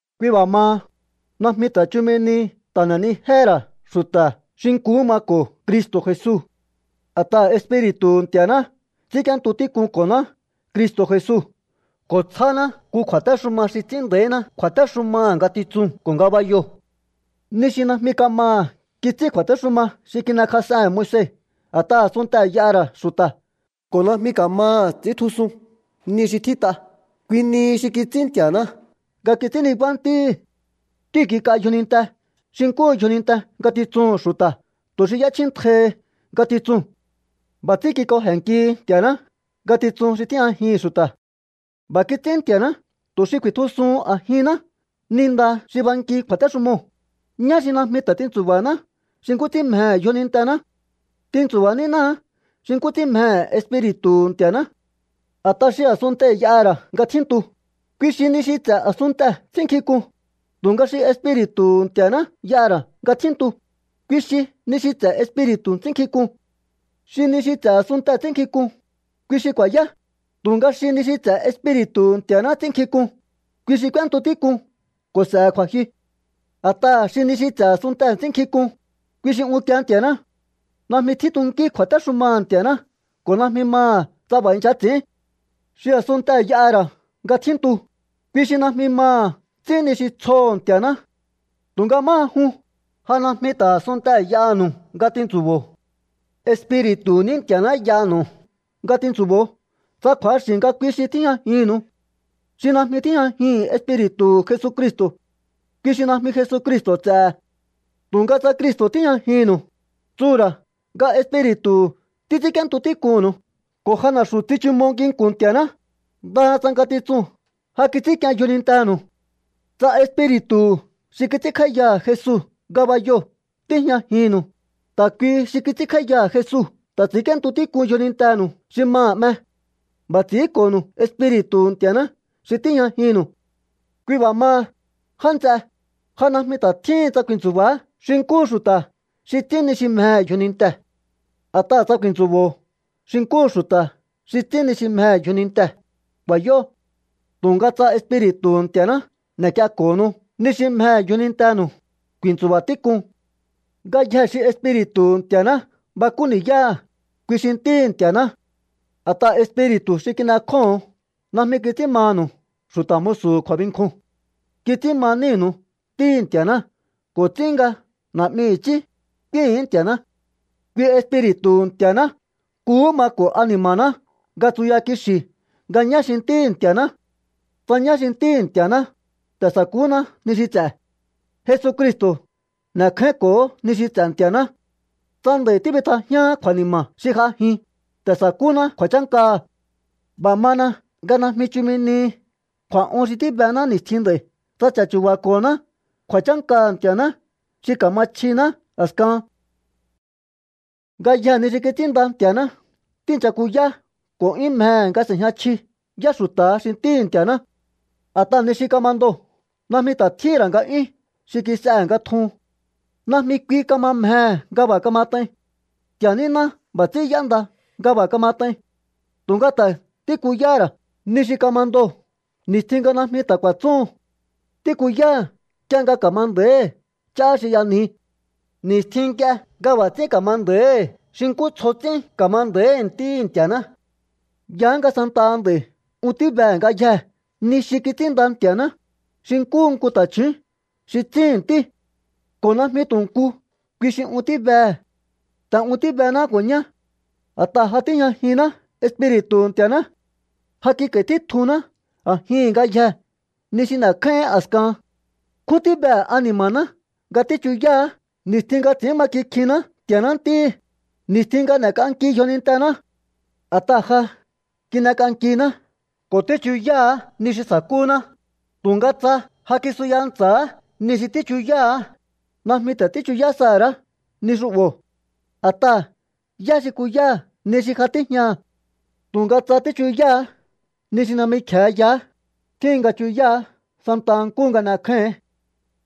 Kui b'a̱ maha, najmi ta̱ chumi nihi ta̱ n'e̱nijéhe̱ ra̱ xu̱ta̱ xi nkuhú mako̱ Cristo̱ Jesu, a̱t'aha̱ Espiri̱tu̱hu̱ Nti̱a̱ná ts'ínk'íéntu tík'unko̱ná Cristo̱ Jesu ko̱ tsjáná nku kju̱a̱téxuma xi ts'ín nda̱íná kju̱a̱téxumaha̱ ngatitsuu̱n ko̱ ngabayoo̱. Ni xi najmi kamaha̱ kits'ín kju̱a̱téxuma xi kin'ekjas'ehe̱n Moise a̱t'aha̱ a̱sunntee̱ y'aha̱ ra̱ xu̱ta̱ ko̱ najmi ka̱maha̱ ts'i̱íntjusun ni xi tjít'a, kui nihi xi kits'ín Nti̱a̱ná nga kits'ín nibá Ntíhi̱. Ntíu̱ kik'a yjoninte xi nkúhu yjoninte ngatitsuhu̱n xu̱ta̱ tu̱ xi y'échjíntjaihi ngatitsuu̱n. B'a̱ ts'ín kik'oje̱nnkihi Nti̱a̱ná ngatitsun xi tíjñajihi̱n xu̱ta̱. B'a̱ kits'ín Nti̱a̱ná tu̱ xi ku̱i̱tjusuhun a̱jinná ni nda xi banki kju̱a̱téxumoo̱, ñá xi najmi ta̱ tintsu̱ba̱haná xi nkú ts'ín mjehe̱ yjonintená. Tintsu̱ba̱ nínáá xi nkú ts'ín mjehe̱ Espiri̱tu̱hu̱ Nti̱a̱ná. A̱t'aha̱ xi a̱sunntee̱ y'aha̱ ra̱ nga tjíntu, kui xi ni xi ts'e̱ a̱sunntee̱ ts'ínnkjink'un, tu̱nga xi Espiri̱tu̱hu̱ Nti̱a̱ná y'aha̱ ra̱ nga tjíntu, kui xi ni xi ts'e̱ Espiri̱tu̱ ts'ínnkjink'un. Xi ni xi ts'e̱ a̱sunntee̱ ts'ínnkjink'un, kui xi ku̱a̱yá, tu̱nga xi ni xi ts'e̱ Espiri̱tu̱hu̱ Nti̱a̱ná ts'ínnkjink'un, kui xi k'úéntu tík'un ko̱ s'e̱he̱ kju̱a̱jyu. A̱t'aha̱ xi ni xi ts'e̱ a̱sunntee̱ ts'ínnkjink'un, kui xi unkie Nti̱a̱ná. Najmi tjíntunkí kju̱a̱téxumaha̱ Nti̱a̱ná ko̱ najmi maha̱ tsa b'a̱ i̱ncha ts'i̱ín. Xi a̱sunntee̱ y'aha̱ ra̱ nga tjíntu, kui xi najmi maha̱ ts'ín ni xi tsjoho̱ Nti̱a̱ná. Tu̱nga máha jun, ja najmi ta̱ a̱sunntee̱ y'aha̱nu̱u nga tintsu̱bo̱o. Espiri̱tu̱hu̱ ní Nti̱a̱ná y'anu̱u nga tintsu̱bo̱o tsa kju̱axi̱ nga kui xi tíjñajinnu̱u. Xi najmi tíjñajihi̱n Espiri̱tu̱hu̱ Jesucristo̱, kui xi najmi Jesucristo̱ ts'e̱he̱. Tu̱nga tsa Cristo̱ tíjñajinnu̱u, tsuhu̱ ra̱ nga Espiri̱tu̱hu̱ títs'ínk'íéntu tík'unnu̱u ko̱ ja na̱xu̱ tsichumo nginku̱n Nti̱a̱ná, ndaha tsa ngatitsuu̱n ja kits'ínk'ien yjonintenu̱u. Tsa Espiri̱tu̱hu̱ xi kits'ínkj'áíyaha̱ Jesu ngabayoo̱ tíjñajinnu̱u, ta̱ kuihi xi kits'ínkj'áíyaha̱ Jesu ta̱ ts'i̱ínk'íéntu tík'un yjonintenu̱u xi maha̱ 'me. B'a̱ ts'i̱ínko̱nu̱u Espiri̱tu̱hu̱ Nti̱a̱ná xi tíjñajinnu̱u. Kui b'a̱ maha, já nts'e, ja najmi ta̱ tjíhin tsa ku̱i̱ntsu̱ba̱á xi nkúhu xu̱ta̱ xi ts'ín ni xi mjehe̱ yjonintee̱. A̱t'aha̱ tsa ku̱i̱ntsu̱bo̱o xi nkúhu xu̱ta̱ xi ts'ín ni xi mjehe̱ yjonintee̱, ku̱a̱yó. Tu̱nga tsa Espiri̱tu̱hu̱ Nti̱a̱ná n'e̱k'ienko̱honu ni xi mjehe̱ yjonintenu̱u, ku̱i̱ntsu̱ba̱ tík'un. Ngayjee̱ xi Espiri̱tu̱hu̱ Nti̱a̱ná bakú ni̱yáha̱, kui xi ntíhi̱ Nti̱a̱ná. A̱t'aha̱ Espiri̱tu̱ xi kin'ekjóho̱on najmi kits'ín manu̱u xu̱ta̱ musu̱hu̱ kju̱a̱binkjuu̱n. Kits'ín ma nínu̱u Ntíhi̱ Nti̱a̱ná ko̱ ts'ín nga: “Na̱'mi i̱chí”, k'úíhi̱ín Nti̱a̱ná. Kui Espiri̱tu̱hu̱ Nti̱a̱ná nkuhú mako̱ ani̱ma̱ná nga tsuya kixi̱ nga ñá xi ntíhi̱ Nti̱a̱ná. Tsa ñá xi ntíhi̱ Nti̱a̱ná, ta̱ sa̱kúná ni xi ts'e̱. Jesucristo̱ n'e̱kjáínko̱óho̱ ni xi ts'e̱ Nti̱a̱ná. Tsa nd'a̱i̱ tíbitjajíaán kju̱a̱ni̱ma̱ xi j'ajin, ta̱ sa̱kúná kju̱a̱chánkaha̱. B'a̱ mana nga najmi chumi nihi kju̱a̱'un xi tíbená ni̱stjin nd'a̱i̱ tsa ch'a̱chu̱ba̱ko̱honá kju̱a̱chánkaha̱ Nti̱a̱ná xi ka̱ma chjiná a̱skahan. Ngayjee̱ ni xi kits'ínnda Nti̱a̱ná tíi̱ncha kuyá ko̱ 'yún mjehe̱ nga s'e̱jña chji yá xu̱ta̱ha xi ntíhi̱ Nti̱a̱ná. A̱t'aha̱ ni xi kamandoo̱ najmi ta̱ tjíhi̱n ra̱ nga'yún xi kis'ehe̱ nga tjuhun. Najmi kui kama mjehe̱ nga b'a̱ kamat'ain. Nti̱a̱ níná b'a̱ ts'ín y'énda nga b'a̱ kamat'ain. Tu̱nga ta̱ tíkuyahá ra̱ ni xi kamandoo̱ ni̱stjin nga najmi ta̱ ku̱a̱tsúhun. Tíkuyáha̱ nk'ie nga ka̱ma nda̱íhi̱ ch'á xi y'anji, ni̱stjin nk'ie nga b'a̱ ts'ín ka̱ma nda̱íhi̱ xi nkú tsjo ts'ín ka̱ma nda̱íhi̱ ntíhi̱ Nti̱a̱ná. Yaá nga santaha nd'a̱i̱ un tíbehe̱ ngayjee̱ ni xi kits'ínnda Nti̱a̱ná, xi nkúhu nku ta̱chju̱ún xi tsíhi̱n ntí. Ko̱ najmi tu̱ nku kui xi un tíbehe̱. Ta̱ un tíbená ko̱ ñá. A̱t'aha̱ ja tíjñajinná Espiri̱tu̱hu̱ Nti̱a̱ná. Ja kik'a̱i̱ títjunná a̱jihi̱n ngayjee̱ ni xi n'e̱kjáíhi̱ín a̱skahan. Nkjún tíbehe̱ ani̱ma̱ná nga tíchuyáha̱á ni̱stjin nga ts'i̱ín ma kikjinná Nti̱a̱ná ntíhi̱, ni̱stjin nga n'e̱k'anki yjonintená. A̱t'aha̱ ja kin'ek'ankiná ko̱ tíchuyáha̱á ni xi sa̱kúná, tu̱nga tsa ja kisuya ntsa̱á ni xi tíchuyáha̱á, najmi ta̱ tíchuyá saha̱ ra̱á ni xu'bo̱. ¿A̱t'aha̱ yá xi kuyáha̱ ni xi ja tíjñaha̱? Tu̱nga tsa tíchuyáha̱á ni xi najmi kje̱e yaá, tjíhin nga chuyáha̱á santa nkúhu nga n'ekjáíhi̱ín.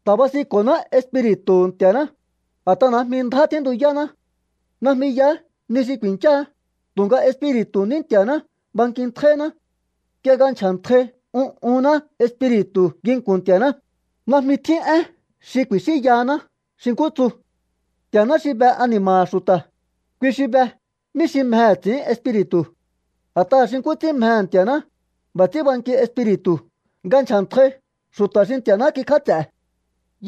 Ta̱ basinko̱ná Espiri̱tu̱hu̱ Nti̱a̱ná, a̱t'aha̱ najmi ndjá tjíntuyáná. Najmi yaá ni xi ku̱i̱ncháá, tu̱nga Espiri̱tu̱hu̱ ní Nti̱a̱ná bankintjáíná. Nk'ie nga nchja̱ntjai un'unná Espiri̱tu̱ nginku̱n Nti̱a̱ná, najmi tjín én xi ku̱i̱xínyahaná xi nkú tsu. Nti̱a̱ná xi be ani̱ma̱ha̱ xu̱ta̱, kui xi be mí xi mjehe̱ ts'i̱ín Espiri̱tu̱. A̱t'aha̱ xi nkú ts'ín mjehe̱ Nti̱a̱ná, b'a̱ ts'ín banki Espiri̱tu̱ nga nchja̱ntjai xu̱ta̱ xi Nti̱a̱ná kikjáts'e̱.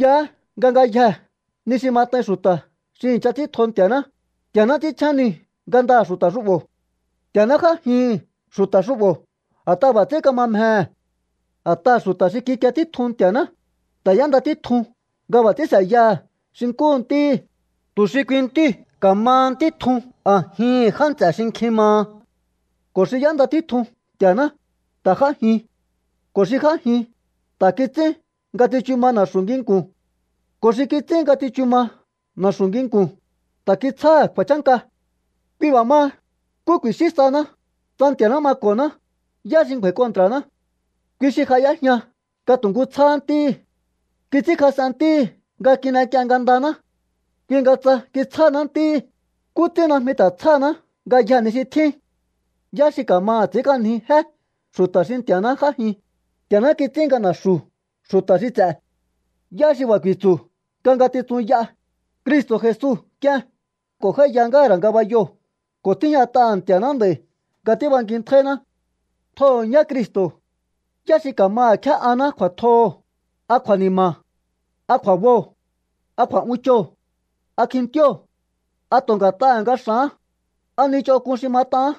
Yaá nga ngayjee̱ ni xi mat'ain xu̱ta̱ xi i̱ncha ts'íntjo Nti̱a̱ná, Nti̱a̱ná ts'ínchjén niu̱ ngandaha̱ xu̱ta̱ xu'bo̱. Nti̱a̱náhá j'ájihi̱n xu̱ta̱ xu'bo̱ a̱t'aha̱ b'a̱ ts'ín kama mjehe̱. A̱t'aha̱ xu̱ta̱ xi kikie títjun Nti̱a̱ná, ta̱ y'énda títjun nga b'a̱ ts'ín s'e̱yaha̱ xi nkúhu Ntíhi̱, tu̱ xi kui Ntíu̱ ka̱maha Ntí tjun a̱jihi̱n já nts'e̱ xi nkjin maha. Ko̱ xi y'énda títjun Nti̱a̱ná, ta̱ j'ájin. Ko̱ xi j'ájin, ta̱ kits'ín nga tsichu ma na̱xu̱ nginku̱n. Ko̱ xi kits'ín nga tsichu ma na̱xu̱ nginku̱n, ta̱ kitsjáha̱ kju̱a̱chánka. Kui b'a̱ maha, ¿nkú ku̱i̱xín sahaná? Tsa Nti̱a̱ná mako̱ná, ¿yá xi ngju̱a̱i̱ kontra̱ná? Kui xi ja y'éjña nga tu̱ nkú tsjáhá Ntíhi̱. Kits'ínkjas'en Ntíhi̱ nga kin'ek'ien ngandaná. Kui nga tsa kitsjáná Ntíhi̱, ¿nkú ts'ín najmi ta̱ tsjáhaná ngayjee̱ ni xi tjín? ¿Yá xi ka̱maha̱ ts'i̱ínk'anji jé xu̱ta̱ xi Nti̱a̱ná j'ájin? Nti̱a̱ná kits'ín nga na̱xu̱ xu̱ta̱ xi ts'e̱. ¿Yá xi b'a̱ ku̱i̱tsu̱ nga ngatitsun y'a? Cristo̱ Jesu k'ien ko̱ j'áíya ngáha̱ ra̱ ngabayoo̱ ko̱ tíjñat'aha̱ Nti̱a̱ná nd'a̱i̱ nga tíbankintjáíná. Tjoho̱ ñá Cristo̱. ¿Yá xi ka̱maha̱ kjé'aná kju̱a̱tjoho̱? ¿A kju̱a̱ni̱ma̱? ¿A kju̱a̱boo̱? ¿A kju̱a̱'unchoo̱? ¿A kjintío̱? ¿A tu̱ nga̱t'aha̱ nga x'a̱án? ¿A ni ch'onk'un xi mat'aán?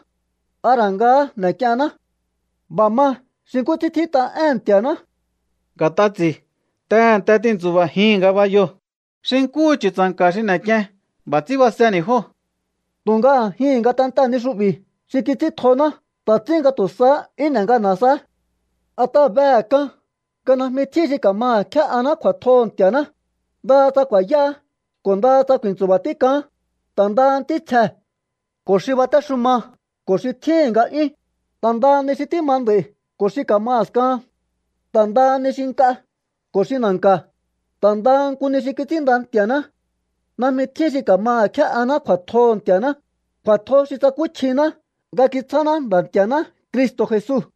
¿A ra̱ ngahá n'e̱k'ienná? B'a̱ ma xi nkú ts'ín tjít'a éhe̱n Nti̱a̱ná: Nga̱t'a ts'i̱ tehe̱nte tintsu̱ba̱jii̱n ngabayoo̱. Xi nkúhu chu̱tsa̱nka̱ xi n'ek'ien, b'a̱ ts'ín baseni̱ jóo̱. Tu̱nga a̱jihi̱n ngatentee̱ ni xu'bi̱ xi kits'íntjoná ta̱ ts'ín nga tu̱ sahá 'yún n'e ngana̱ saá. A̱t'aha̱ behe̱ k'an nga najmi tjín xi ka̱maha̱ kjé'aná kju̱a̱tjoho̱ Nti̱a̱ná, ndaha tsa ku̱a̱yáá ko̱ ndaha tsa ku̱i̱ntsu̱ba̱ tík'aán, ta̱ ndaha ntítsjee̱ ko̱ xi batéxuma ko̱ xi tjíhi̱n nga'yún, ta̱ ndaha ni xi tíma nd'a̱i̱ ko̱ xi ka̱ma a̱skahan, ta̱ ndaha ni xi nk'a ko̱ xi na̱nka̱, ta̱ ndaha nku ni xi kits'ínnda Nti̱a̱ná. Najmi tjín xi ka̱maha̱ kjé'aná kju̱a̱tjoho̱ Nti̱a̱ná, kju̱a̱tjo xi tsakúchjiná nga kitsjáná Nda̱ Nti̱a̱ná Cristo̱ Jesu.